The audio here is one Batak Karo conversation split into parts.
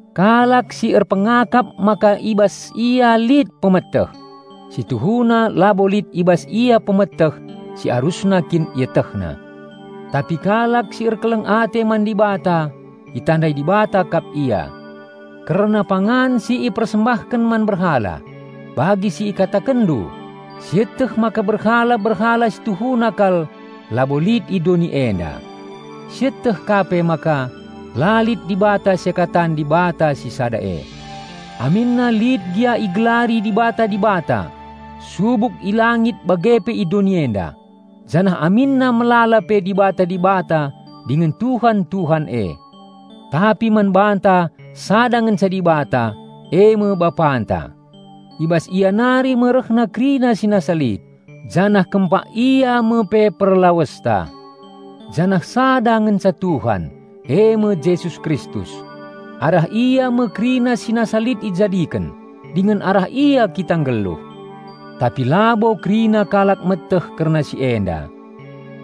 Kalak si erpengakap maka i bas ia lit pemeteh, si tuhuna labo lit i bas ia pemeteh si arusna kin ietehna. Tapi kalak si erkeleng ate man Dibata itandai Dibata kap ia. Kerna pangan si ipersembahken man berhala; bagi si ikatakenndu, "Sieteh maka berhala-berhala si tuhuna kal labo lit i doni enda." Sieteh ka pe maka, "La lit Dibata seakatan Dibata si Sada e." Aminna lit gia igelari dibata-dibata, subuk i langit bage pe i doni enda, janah aminna melala pe "dibata-dibata" dingen "tuhan-tuhan" e. Tapi man banta sada ngenca Dibata, eme Bapanta. I bas Ia nari me rehna kerina si nasa lit, janah kempak Ia me pe perlawesta. Janah sada ngenca Tuhan, eme Jesus Kristus. Arah Ia me kerina si nasa lit ijadiken, dingen arah Ia kita nggeluh. Tapi labo kerina kalak meteh kerna si enda.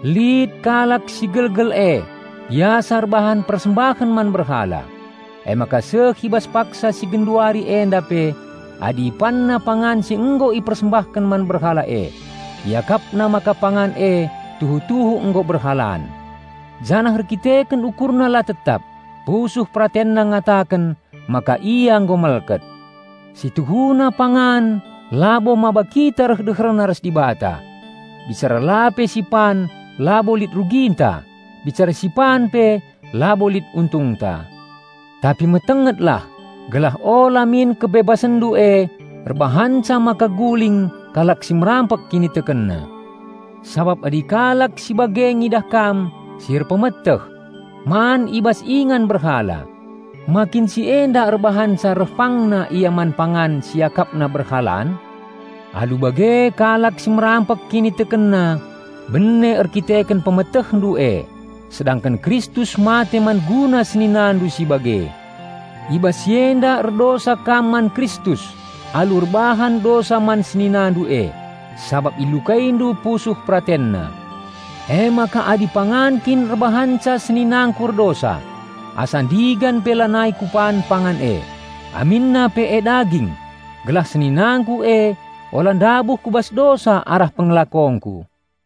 Lit kalak si gelgel e biasa erbahan persembahen man berhala; emaka seh i bas paksa si genduari enda pe adi ipanna pangan si nggo ipersembahken man berhala e, iakapna maka pangan e tuhu-tuhu nggo berhalaan. Janah erkiteken ukurna la tetap, pusuh peratenna ngataken maka ia nggo melket. Si tuhuna pangan labo maba kita reh deherna ras Dibata. Bicara la pe sipan labo lit ruginta; bicara sipan pe labo lit untungta. Tapi metengetlah, gelah ula min kebebasanndu e erbahanca maka guling kalak si merampek kinitekenna. Sabap adi kalak si bage ngidah kam "si erpemeteh" man i bas ingan berhala, ma kin si enda erbahanca reh pangna ia man pangan si iakapna berhalaan? Alu bage kalak si merampek kinitekenna bene erdandanken "pemetehndu" e, sedangken Kristus mate man guna seninandu si bage. I bas si enda erdosa kam man Kristus alu erbahan dosa man seninandu e, sabap ilukaindu pusuh peratenna. Emaka adi pangan kin erbahanca seninangku erdosa, asa ndigan pe lanai kupan pangan e, aminna pe e daging, gelah seninangku e ula ndabuh ku bas dosa arah pengelakongku.